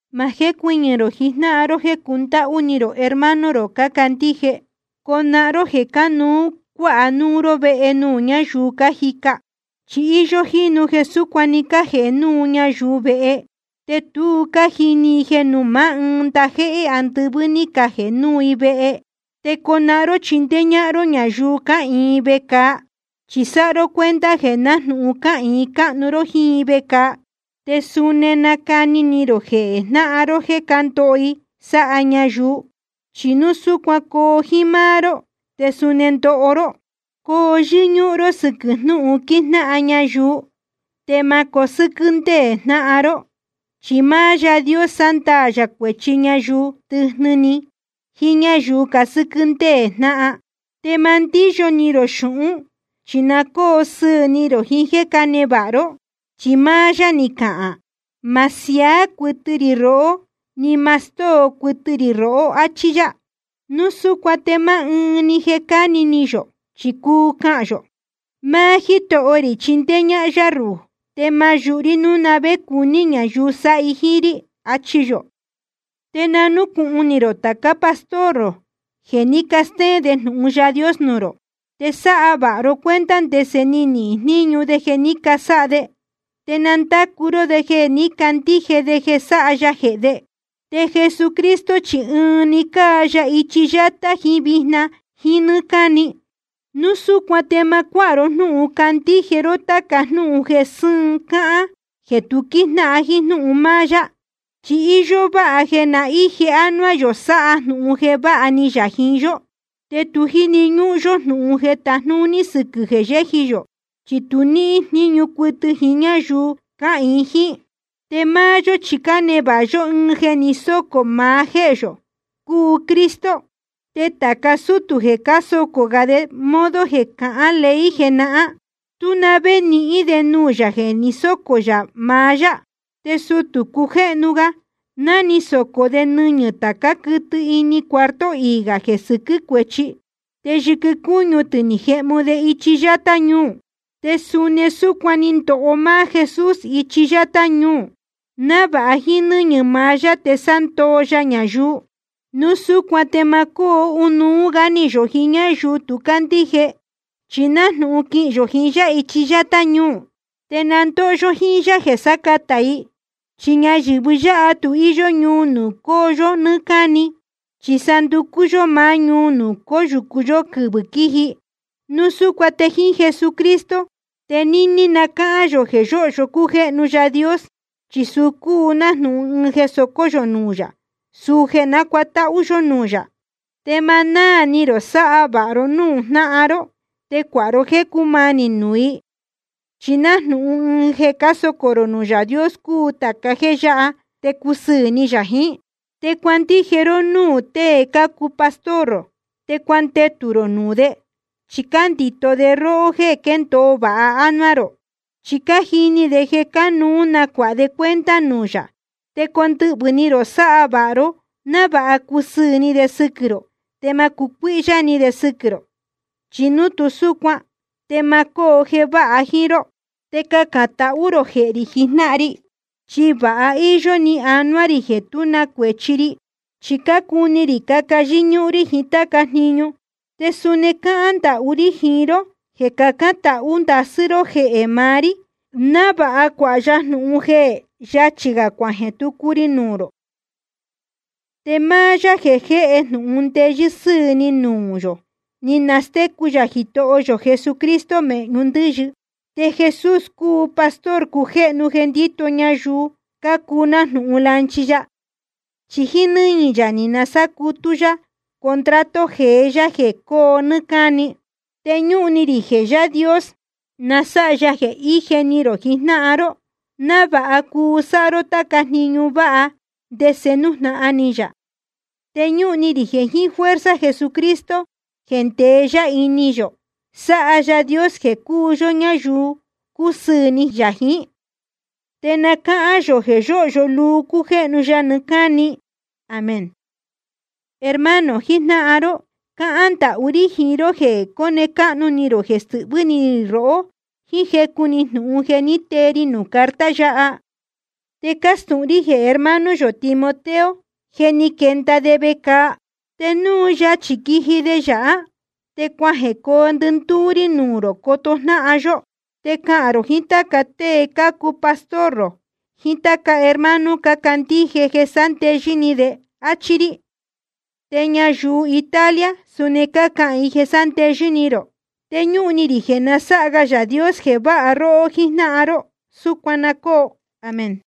Ma jécuɨñɨ̄ rō jijnáhan ró jéē cundáhú ni rō hermano rō cácandíje. Conahán ró jeē cánuú cuáha núu ró vehe nuū ñáyuu cájica. Chi íyó jínu jeē súcuan ni cajēhe núu ñayuu vehe, te tu ní cájini i jeē nuū maá ndajéhé andɨvɨ́ ní cajēhe núu i vehe. Te conahán ró chindéé ñáhán ró ñayuu cáhīin vecāa, chi sáha ró cuenta jeē nájnūhun cáhīin cáhnu ró jíín i vecāa. Te suni nacani ni rō jehē jnáhan ró jéē cándoho i sáha ñayuu, chi núu súcuan coo jíín máá ró te suni ndoho ró. Coo yɨ́ñúhún ró sɨ́quɨ̄ jnúhun quíjnáhan ñayuu, te ma cosɨ́quɨ́ ndéē jnáhan ró. Chi máá Yaā Dios sándaā yā cuēchi ñayuu tɨjnɨ ni jiín ñáyuu casɨ́quɨ́ ndéē jnáhan. Te ma ndíyo ni rō xūhún, chi na cóo sɨɨ̄ ni rō jiín jéē cánevāha ró. Chi máá yá ni cahān: Ma siaá cuɨtɨ rī rohó, ni ma stóo cuɨtɨ rī rohó, áchí yá. Núu súcuan te ma ɨ́ɨn jeē cáni ni yō, chi cuu cahān yō: Máá Jítoho rī chíndéé ñáhán yá ruhū, te ma yūhu rí núu na vé cuní ñayuu sáha i jíín rí. Achi yō. Te na núcūhun ni rō tācá pastor rō, jeē ní castéén de jnūhun Yaā Dios nuū rō. Te sáha vāha ro cuenta ndese ni nihīn jníñu jeē ní casáha de, te na ndácu ró de jeē ní cacandíje de jeē sáha ya jehē de. Te Jesucristo chi ɨɨn‑ni cáa ya ichi yátá jiín vijna jíín nɨ́ɨ́ cáni. Núu súcuan te ma cuáha ró jnúhun candíje ró táca jnúhun jeē sɨ́ɨn cáhán jeē tu quíjnáhan jíín jnúhun máá yá. Chi íyó váha jeē na íje ánuá yō sáha jnūhun jeē váha ni yā jiín yó. Te tu jíni ñúhún yó jnūhun jeē tajnúní sɨquɨ̄ jeē yéji yō, chi tu níhín jníñu cuɨtɨ jiín ñáyuu cáhīin jíín. Te máá yó chi cánevāha yó ɨɨn jeē ni sócō maá jéhē yō, cúu Cristo. Te tāca sútū jeē cásocō gā de modo jeē cahán ley jenahán, tú na vé nihín de nuū yā jeē ni sócō yā maá yá. Te sutū cujéhnu ga, ná ni socō de nɨñɨ̄ tācá quɨtɨ ini cuarto iī gā jeē sɨquɨ́ cuéchi, te yɨquɨ cúñu tɨ̄ ni cajehmu de ichi yátá ñuu. Te suni súcuan ni ndoho máá Jesús ichi yátá ñuu, návāha jíín nɨ́ñɨ̄ maá yá te sándoo ya ñayuu. Núu súcuan te ma cóo ɨnuú gá ni yō jiín ñáyuu tu cácandíje, chi nájnūhun quihīn yō jiín yá ichi yátá ñuu, te na ndóho yó jíín yá jeē sácatā i. Chi ñayɨ̄vɨ yáha tu íyó ñuu nuū coo yó nɨ́ɨ́ cáni, chi sa cánducú yó máá ñuu nuū cóyūcu yó quɨvɨ̄ quíji. Núu súcuan te jeē jiín Jesucristo te níní na cáhán yō jeē yóhyo cújéhnu Yaā Dios, chi suu cúu nájnūhun ɨɨn jeē socó yō nuū yā, suu jeē nácuatáhú yó nuū yā. Te ma náā ni rō sáha vāha ró núū jnáhan ró, te cuāha ró jéē cúmanī nuū i. Chi nájnūhun ɨɨn jeē cásocō rō nuū Yaā Dios cúu tāca jéē yáha, te cúsɨɨ̄ ni yā jiín. Te cuandije ró núū tēe cácuu pastor rō, te cuandetū rō nuū de. Chi cándito de róhó jéē quéndōo vāha ánuá rō, chi cájini de jeē cánuú nacuāha de cuenta nuū yā. Te condɨhvɨ̄ ni rō sáha vāha ró, návāha cusɨɨ̄ ni de sɨquɨ̄ rō te ma cucuíhyá ni de sɨquɨ̄ rō. Chi núu tu súcuan te ma cóo jeē váha jíín ró. Te cacān tahú rō jehē rī jijnáhan ri. Chi vāha íyó ni anuá rī jeē tú na cuēchi ri. Chi cácuni rī caca yɨ́ñúhún rí jiín táca jniñu. Te suni cáhán ndahú rí jiín ró jeē cacán tahū ndasɨ́ ró jehē maá rí, návāha cuāha ya jnūhun jeē yachī gā cuajeē tucu ri nuū rō. Te máá Yaā jeē jéhe jnūhun ndeyɨ́ sɨ́ɨ̄ ni nuū yō, ni nastécu yā Jitoho yō Jesucristo mēhñu ndɨ́yɨ. Te Jesús cúu pastor cujéhnu jeē ndíto ñayuu cácuu nájnūhun lanchi ya. Chi jíín nɨ́ñɨ̄ yā ni sácutú yá contrato jeé yá jeē coo nɨ́ɨ́ cáni. Te ñúhun ni rī jeē Yaā Dios na sáha ya jeē ije ni rō jijnáhan ró, návāha cuu sáha ró táca jniñu váha ndese nújnahan ni yā. Te ñúhun ni rī jeē jiín fuerza Jesucristo jeē ndeé yá ini yō, na sáha Yaā Dios jeē cuu yó ñáyuu cúsɨɨ̄ ni yā jiín. Te na cáhán yō jeē yóhyo luu cújéhnu ya nɨɨ́ cáni. Amén. Hermano jijnáhan ró, cáhán ndahú rí jiín ró jeē cone cáhnu ni rō jeē stɨhvɨ́ ni rī rohó jíín jecu‑ni jnūhun ni tee ri nuū carta yáha. Te cástūhun rí jeē hermano yō Timoteo, je ni quenda de vecāa. Te núu yachī quiji de yāhá, te cuajecoo ndɨndúú rí nuū rō coto jnáhan yó. Te cahān rō jiín táca tée cácuu pastor rō jiín táca hermano cácandíje jeē sándeyɨ́ ni de, áchí rí. Te ñayuu Italia suni cácahān i jeē sándeyɨ́ ni rō. Te ñúhun ni rī jeē na sáha ga Yaā Dios jeē váha róhó jíjnáhan ró. Súcuan na cóo. Amén.